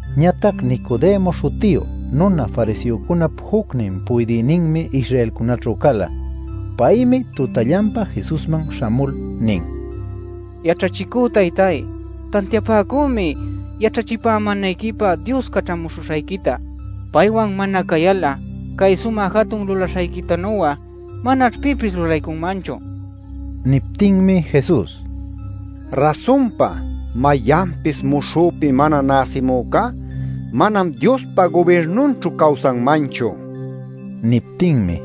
Ñatac Nicodemo śhutiyu nuna fariseocunap jucnin puydïninmi Israelcunäćhu cala. Paymi tutallanpa Jesusman śhamul nin: “Yaćhachicü taytay, tantiapäcümi yaćhachipämänayquipä Dios caćhamuśhuśhayquita. Paywan mana cayal'a cay sumä jatun lulaśhayquitanu'a manaćh pipis lulaycunmanchu” nil. Niptinmi Jesus: “Rasunpa mayanpis muśhüpi mana näsimücá, manam Diospa gubirnunćhu cawsanmanchu” nin. Niptinmi: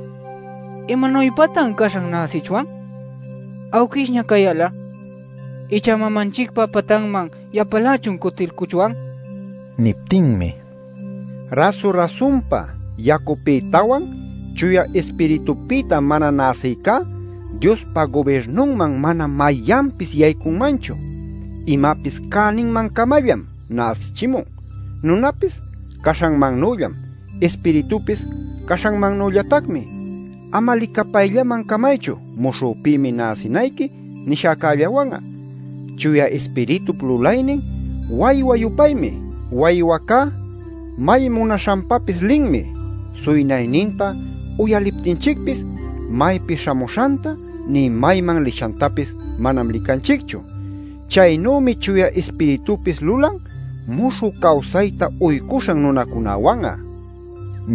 “¿Imanuypatan caśhan näsichwan awquishña cayal'a? ¿Icha mamanchicpa patanman yapalächun cutilcuchwan?” nin. Niptinmi: “Rasu-rasunpa yacupïtawan Chuya Ispiritupïta mana näsïcá, Diospa gubirnunman manam mayanpis yaycunmanchu. Imapis cäninman-camallam näsichimun: nunapis caśhanmannüllam; Ispiritupis caśhanmannüllatacmi. Ama licapayllaman camaychu ‘Muśhüpïmi näsinayqui’ nishäcällawan'a. Chuya Ispiritup lulaynin waywa-yupaymi: waywacá may munaśhanpapis linmi. Suynayninta uyaliptinchicpis, maypi śhamuśhanta nï mayman lishantapis manam licanchicchu. Chaynümi Chuya Ispiritupis lulan muśhü cawsayta uycuśhan nunacunäwan'a” nin.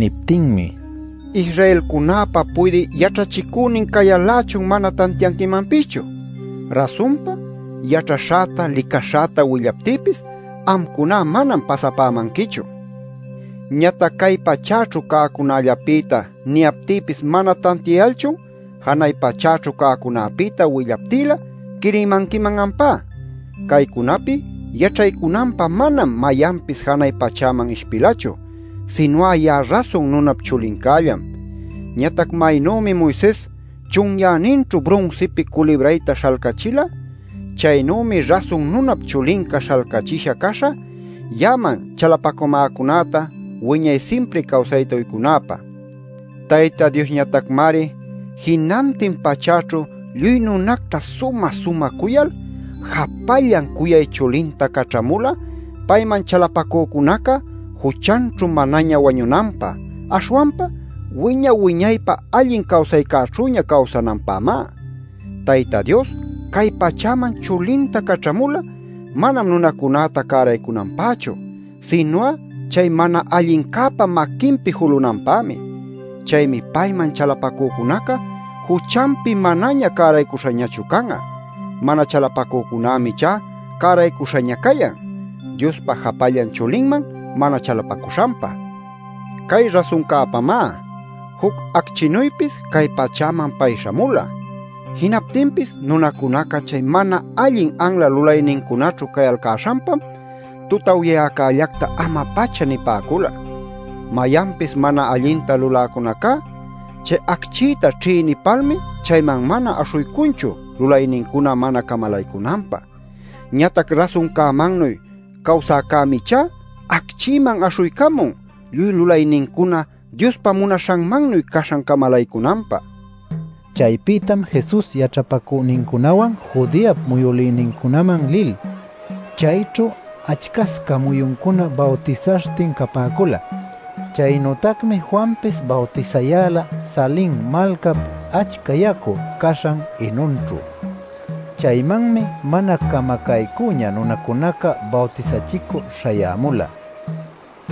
Niptïmi: “Israelcunäpa puydï yaćhachicünin cayal-lächun mana tantianquimanpischu. Rasunpa yaćhaśhäta licaśhäta willaptïpis, amcuná manam pasapämanquichu. Ñatac cay pachäćhu cäcunällapïta niyaptïpis mana tantiayalchun, janay pachäćhu cäcunäpïta willaptïlä quirimanquiman ampá. Caycunapi yaćhaycunanpä manam mayanpis janay pachäman ishpilachu, sinu'a ya'a Rasun Nunap Chulincällam. Ñatac maynümi Moises chunyäninćhu brunsipi culibrayta śhalcachila, chaynümi Rasun Nunap Chulinca śhalcachisha caśhä, ya'aman chalapacamäcunäta wiñay simpri cawsayta uycunäpä. “Tayta Diosñatacmari jinantin pachäćhu lluy nunacta sumä-sumä cuyal, japallan cuyay chulinta caćhamula payman chalapacücunaca juchanćhu manaña wañunanpä, aśhwanpa wiña-wiñaypä allin cawsaycäćhüña cawsananpämá. Tayta Dios cay pachäman chulinta caćhamula manam nunacunäta cäraycunanpächu, sinu'a chay mana allincäpa maquinpi julunanpämi. Chaymi payman chalapacücunaca juchanpi manaña cäraycuśhañachu can'a. Mana chalapacücunämi ichá cäraycüśhaña cayan, Diospa japallan chulinman mana chalapacuśhanpa. Cay rasuncäpamá: juc acchinuypis cay pachäman pay śhamula. Jinaptinpis nunacunaca chay mana allin anla lulaynincunaćhu cayalcäśhanpam tutawyäcallacta ama-pacha nipäcula. Mayanpis mana allinta luläcunacá chay acchïta ćhïnipalmi chayman mana aśhuycunchu lulaynincuna mana camalaycunanpä. Ñatac rasuncämannuy cawsäcämi ichá, acchïman aśhuycamun, lluy lulaynincuna Diospa munaśhanmannuy caśhan camalaycunanpä” nin. Chaypïtam Jesus yaćhapacünincunawan Judeap muyülïnincunaman lil, chayćhu achcasca muyuncuna bawtisaśhtin capäcula. Chaynütacmi Juanpis bawtisayäla Salin malcap achca yacu caśhan Enonćhu. Chaymanmi mana camacaycüña nunacunaca bawtisachicü śhayämula.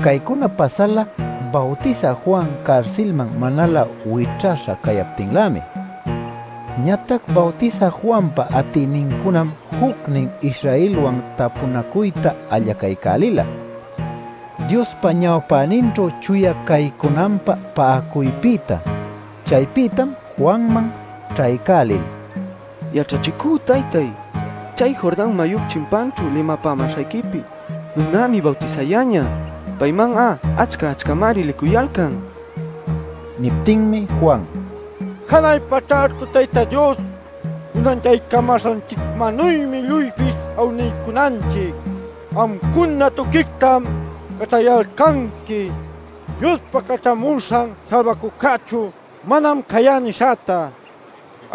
(Caycuna pasala Bawtisä Juan carsilman manalä wićhaśha cayaptinlämi.) Ñatac Bawtisä Juanpa atïnincunam jucnin Israelwan tapunacuyta allacaycälila, Diospa ñawpäninćhu chuya caycunanpä pa'acuypïta. Chaypïtam Juanman ćhaycälil: “Yaćhachicü taytay, chay Jordan mayup chimpanćhu limapämäśhayquipi nunämi bawtisayäñä. ¡Payman'a achca-achcamari licuyalcan!” nicuyalcan. Niptinmi Juan: “Janay pachäćhu Tayta Dios unanchaycamäśhanchicmannuymi lluypis awniycunanchic. Amcuna tuquictam yaćhayalcanqui ‘Diospa Caćhamuśhan Salbacücächu manam cayá’ nishäta.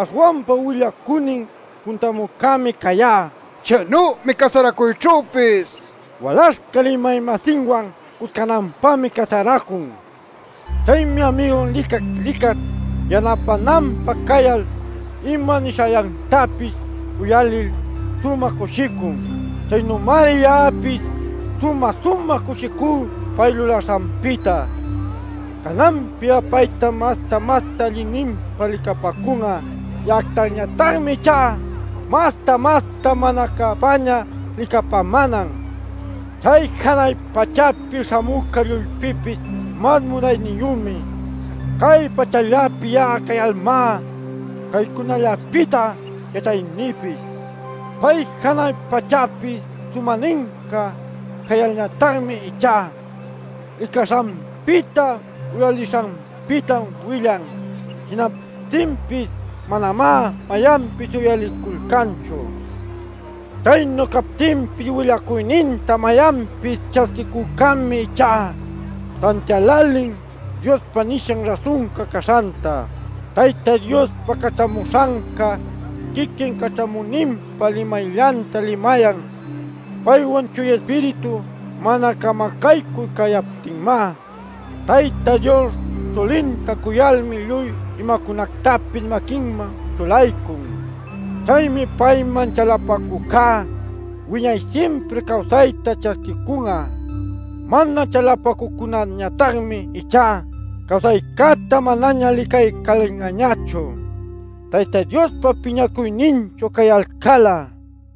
Aśhwanpa willacünin puntamücämi cayá. Chaynümi casaracuyćhüpis. Walaśhca limay-masinwan cuscananpämi casaracun. Chaymi amigun licat-licat yanapänanpä cayal ima nishallantapis uyalil sumä cushicun. Chaynümari ya'apis sumä-sumä cushicú pay lulaśhanpïta. Cananpi'a paytam masta-masta allinninpa licapäcun'a; ya'actañatacmi ichá masta-masta mana cäpäña licapämänan. “Chay janay pachäpi śhamücá lluypïpis mas munayniyümi. Cay pachällapi ya'a cayalmá caycunallapïta yaćhaynïpis. Pay janay pachäpi sumäninca cayalñatacmi ichá licaśhanpïta uyalishanpïta willan. Jinaptinpis manamá mayanpis uyaliculcanchu. Chaynu captinpis willacuyninta mayanpis ćhasquicücämi ichá, tantiälälin Diospa nishan rasunca caśhanta. Tayta Diospa caćhamuśhanca quiquin caćhamüninpa limayllanta limayan, paywan Chuya Ispiritu mana camacaycü cayaptinmá. Tayta Dios chulinta cuyalmi lluy imacunactapis maquinman ćhulaycun. Chaymi payman chalapacücá wiñay simpri cawsayta ćhasquiycun'a. Mana chalapacücunañatacmi ichá cawsaycäta manaña licaycälin'añachu, Tayta Diospa piñacuyninćhu cayalcal'a” nin.